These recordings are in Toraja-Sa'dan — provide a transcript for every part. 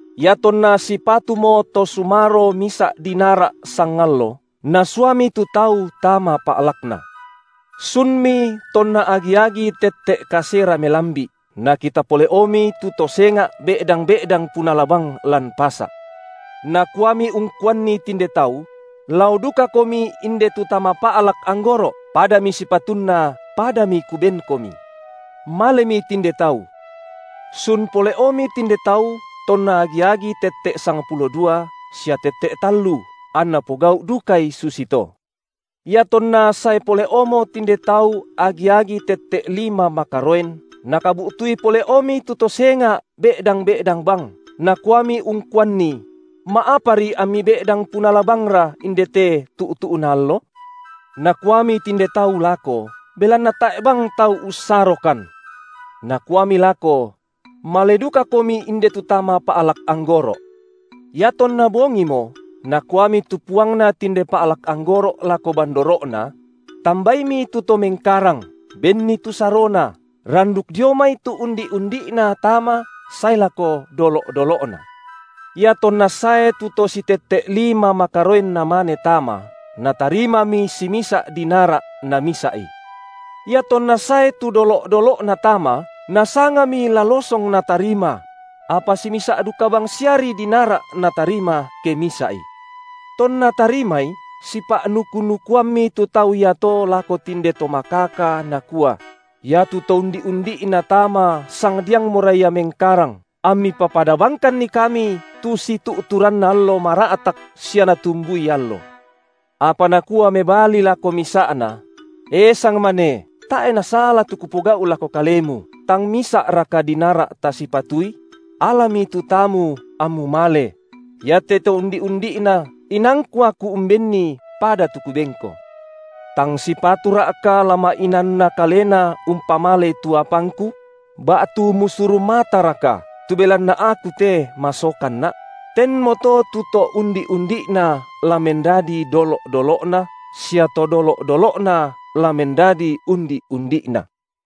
Iatonna sipatumo to sumaro misa’ dinara’ sangallo, nasuami tu tau tama pa’lakna. Sunmi tonna agi-agi tette’ kasera melambi’, nakita pole’omi tu to senga’ be’dang-be’dang punala bang lan pasa’. Nakuami ungkuanni tinde tau: Lao dukakomi inde tu tama pa’lak anggoro’, padami sipatunna padami kubenkomi. Malemi tinde tau. Sun pole’omi tinde tau tonna agi-agi tette’ sangpulo dua, sia tette’ tallu, anna pogau’ dukai susito. Iatonna sae pole’omo tinde tau agi-agi tette’ lima makaroen, nakabu’tui pole’omi tu to senga’ be’dang-be’dang bang, nakuami ungkuanni: Ma’apari ammi be’dang punala bangra indete tu’tu’na allo? Nakuami tinde tau lako: Belanna tae’ bang tau ussarokan. Nakuami lako: Male dukakomi inde tu tama pa’lak anggoro’. Iatonna bongimo nakuami tu puangna tinde pa’lak anggoro’ lako bandoro’na: Tambaimi tu to mengkarang, benni tu sarona, randuk dio mai tu undi’-undi’na tama sae lako dolo’-dolo’na. Iatonna sae tu to sitette’ lima makaroen namane tama, natarimami simisa’ dinara’ namisa’i. Iatonna sae tu dolo’-dolo’na tama, nasangami la losong natarima; apa simisa’ duka bangsiari dinara’ natarima ke misa’i. Tonna tarimai, sipa’nuku-nuku- ammi tu tau iato lako tinde to makaka, nakua: Iatu to undi’-undi’na tama sangdiangmora ia mengkarang, ammi papada bangkanni kami tu situ’turanna allo mara’tak sia natumbui allo. Apa nakua mebali lako misa’na: E sangmane, tae’ nasala tu kupogau’ lako kalemu, tang misa’raka dinara’ tasipatui? Alami tu taamu, ammu male; iate to undi’-undi’na inaangku aku umbenni pada tu kubenko. Tang sipatura’ka la ma’inaanna kalena umpamalei tu apangku? Ba’tu musuru mataraka, tu belanna aku te masokanna’? Tenmoto tu to undi’-undi’na la mendadi dolo’-dolo’na, sia to dolo’-dolo’na la mendadi undi’-undi’na.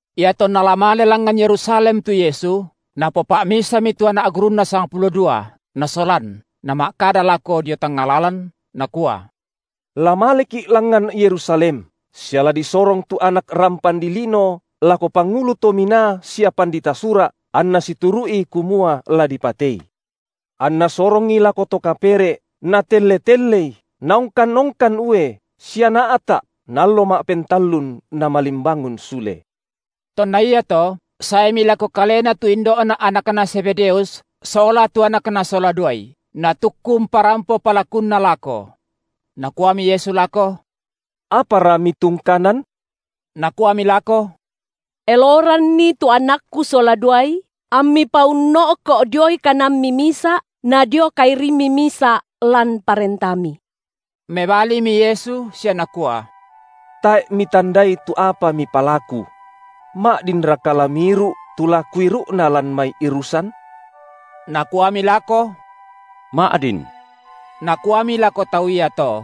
Iatonna la male langngan Yerusalem tu Yesu, Napopa’misami tu anak gurunNa sangpulo dua Nasolan, Nama’kada lako dio tangnga lalan, Nakua: La maleki’ langngan Yerusalem, sia la disorong tu Anak rampan dilino lako pangulu to minaa sia pandita Sura’, anna situru’i kumua la dipatei. Anna sorongi lako to kapere’, natelle-tellei, naongkan-ongkan ue, sia naa’ta’, na allo ma’pentallun Namalimbangun sule. Tonna iato saemi lako Kalena tu indo’na anakna Zebedeus sola tu anakna sola duai, natukku umparampo palakunna lako. Nakuami Yesu lako: Apara mitungkanan? Nakuami lako: Eloranni tu anakku sola duai ammi paunno’ko’ dioi kananMi misa’ na dio kairimMi misa’ lan ParentaMi. Mebalimi Yesu sia Nakua: Tae’ mitandai tu apa mipalaku. Ma’dinraka la miiru’ tu la Kuiru’na lan mai irusan? Nakuami lako: Ma’din. Nakuami lako tau iato: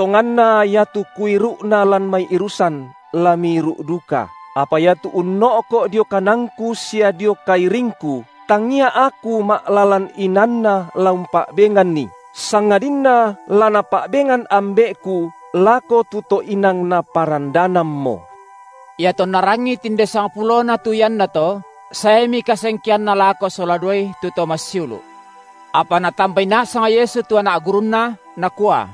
Tonganna iatu Kuiru’na lan mai irusan la miiru’ duka, apa iatu unno’ko’ dio kananKu sia dio kairingKu, tangia Aku ma’lalan inaanNa la umpa’benganni, sangadinna la Napa’bengan Ambe’Ku lako tu to inang Naparandanammo. Iatonna rangi tinde sangpulona tu iannato, saemi kasengkeanna lako sola duai tu to massiulu’. Apa Natambai nasang Yesu tu anak gurunNa, Nakua: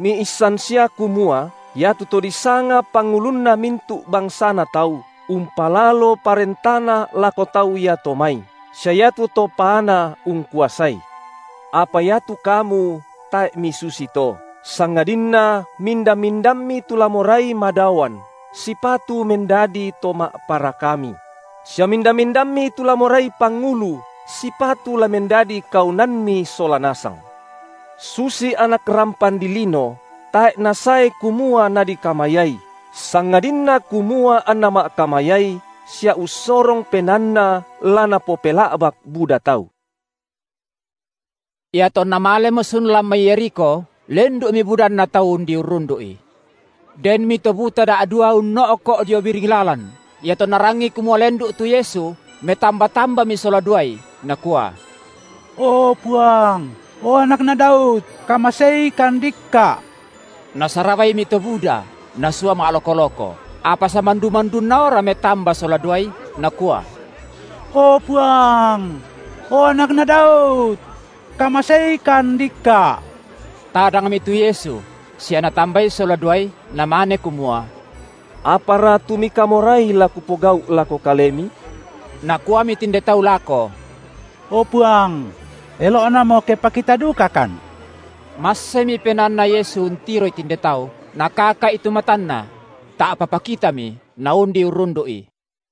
Miissan sia kumua iatu to disanga pangulunna mintu’ bangsana tau, umpalalo parentana lako tau iato mai, sia iatu to paana ungkuasai. Apa iatu kamu tae’ misusito, sangadinna minda-mindammi tu la morai madaoan, sipatu mendadi to ma’parakami; sia minda-mindammi tu la morai pangulu, sipatu la mendadi kaunanmi sola nasang. Susi Anak rampan dilino tae’ Nasae kumua Nadikamayai, sangadinna kumua anNa ma’kamayai sia ussorong penaanNa la napopela’bak buda tau. Iatonna malemo sun lan mai Yerikho, lendu’mi budanna tau undi urrundu’I. Denmi to buta da’dua unno’ko’ dio biring lalan; iatonna rangi kumua lendu’ tu Yesu, metamba-tambami sola duai, nakua: O Puang, o Anakna Daud, kamaseikan dikka’! Nasarabaimi to buda, nasua ma’loko-loko, apa samandu-mandunnaora metamba sola duai, nakua: O Puang, o Anakna Daud, kamaseikan dikka’! Tadangmi tu Yesu, sia Natambai sola duai, Namane kumua: Apara tu mikamorai la Kupogau’ lako kalemi? Nakuami tinde tau lako: O Puang, elo’namo ke pakita dukakan. Massemi penaanNa Yesu untiroi tinde tau, Nakaka’i tu matanna: ta’pa pakitami, naundi urrundu’I.